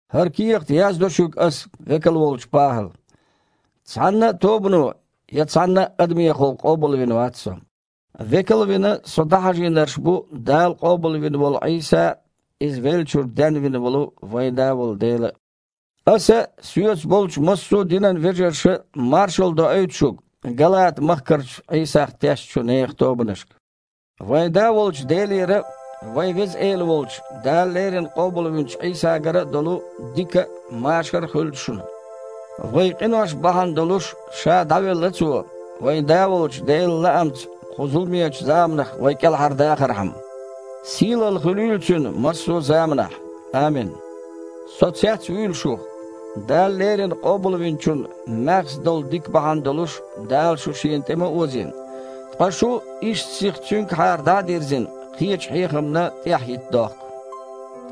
ХІара кехат яздо шуьга аса, векал волчу ПахІала. Цхьанна а тобано я цхьанна а адамехула къобалвина вац со. Векал а вина, со дІахьажийнарш бу Дала къобалвина волу Іийса а, Иза веллачуьра денвина волу вайн Да волу Дела а. Аса а, соьца болчу массо а динан вежарша а маршалла доуьйту шуьга, Галата-махкарчу Іийсах тешначу нехан тобанашка. Вайн Да волчу Делера а, вайн Веза Эла волчу Дала леррина къобалвинчу Іийсагара а долу дика а, машар а хуьлда шуна. Вайн къинош бахьана долуш Ша дІавелла Цо, вайн Да волчу Делан лаамца кху зуламечу заманах вай кІелхьардахархьама. Сийлалла хуьлийла Цуьнан массо а заманахь. Амин. Со цецвуьйлу шух! Дала леррина Къобалвинчун маьхза долу дика бахьана долуш Дала шу Шена тІе ма озийна! Ткъа шу, иштта сиха Цуьнгахьара дІа а дирзина, кхечу хьехамна тІаьхьахІитта дохку.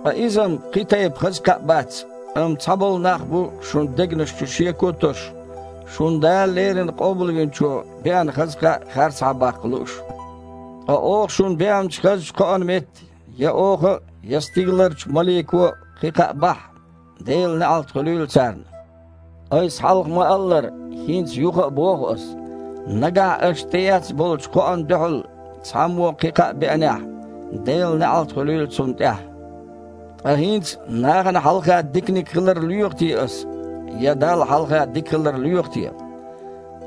Ткъа иза-м кхин тайпа хаза кхаъ бац, амма цхьаболу нах бу шун дегнаш чу шеко а тосуш, шуна Дала леррина Къобалвинчо беана хаза кхаъ харцахьабаккха лууш. Ткъа оха шуна беанчу хазачу кхоана метта я оха а, я стигаларчу малико а кхин кхаъ бахьахь, Делан неІалт хуьлийла царна. Айса хьалха ма-аллара, хІинца юха а боху ас: нагахь аша тІеэцна болчу кхоана дуьхьал цхьаммо кхин кхаъ беанехь, Делан неІалт хуьлийла цунна тІехь. Ткъа хІинца нахана хьалха диканиг хилар лоьху те ас я Далла хьалха дика хилар лоьху те?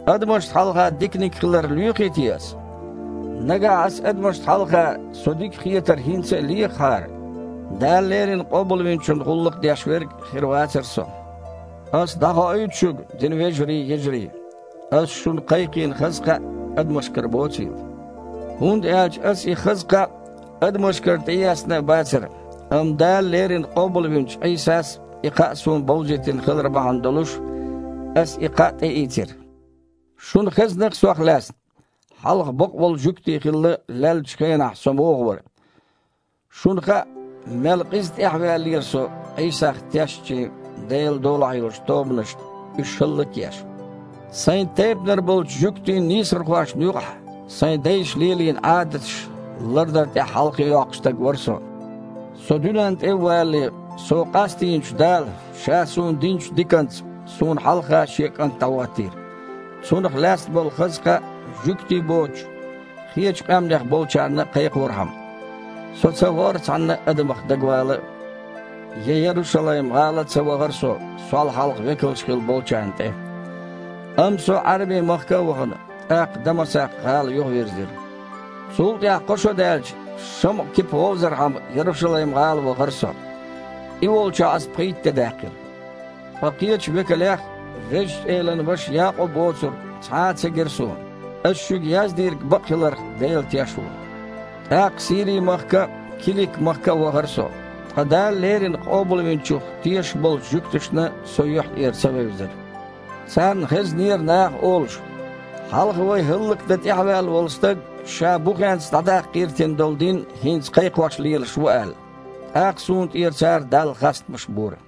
Адамашна хьалха диканиг хилар лоьхий те ас? Нагахь аса адамашна хьалха со дика хетар хІинца а лехахьара, Дала леррина Къобалвинчун гІуллакх деш верг хир вацара со. Аса дІахоуьйту шуьга, динан вежарий, йижарий, ас шуна кхайкхийна хаза кхаъ адамашкара боцийла. ХІунда аьлча аса и хаза кхаъ адамашкара тІеэцна а бацара, амма Дала леррина къобалвинчу Іийсас и кхаъ суна бовзийтина хилар бахьана долуш, ас и кхаъ тІеийцира. Шуна хезна-кх сох лаьцна, хьалха бакъволу жуьгти хилла леллачу хенахь со муха вара. Шуна хаьа, мел къиза тІаьхьаваьллера со Іийсах тешначийн Делан долахь йолчу тобанашна, уьш хІаллак а еш. Сайн тайпанара болчу жуьгтийн нийсархошна юкъахь, сайн дайша лелийна Іадаташ лардар тІехь хьалхе йоккхуш стаг вара со. Со дуьненна тІе а валале, со къастийначу Дала, Ша суна динчу диканца, суна хьалха Шен КІант дІахІоттийра, Цунах лаьцна болу хаза кхаъ, жуьгтий боцучу, кхечу къаьмнех болчарна а кхайкхорхьама. Со ца вахара цхьанна а адамах дагавала а, я Ярушалайм-гІала а ца вахара со, сол хьалха векалш хилла болчарна тІе. Амма со Іаьрби-махка а вахана, тІаккха Дамасакх-гІала юхавирзира. Цул тІаьхьа, кхо шо даьлча, ШамІа-Кипа вовзархьама Ярушалайм-гІала вахара со. И волчохь аса пхийтта де даьккхира. Ткъа кхечу векалех, Везачу Элан ваша Якъуб воцург, цхьа а ца гира суна. Ас шуьга яздийриг бакъ хиларх Дела теш ву. ТІаккха Сири-махка а, Килик-махка а вахара со. Ткъа Дала леррина Къобалвинчух тешаш болчу жуьгташна со юьхь тІера ца вевзара. Царна хезнера, наха олуш: «Хьалха вай хІаллакдан тІаьхьаваьлла волу стаг ша бухенца дІадаккха гІиртина долу дин хІинца кхайкхош лелаш ву», – аьлла. ТІаккха суна тІера цара Далла хастамаш бора.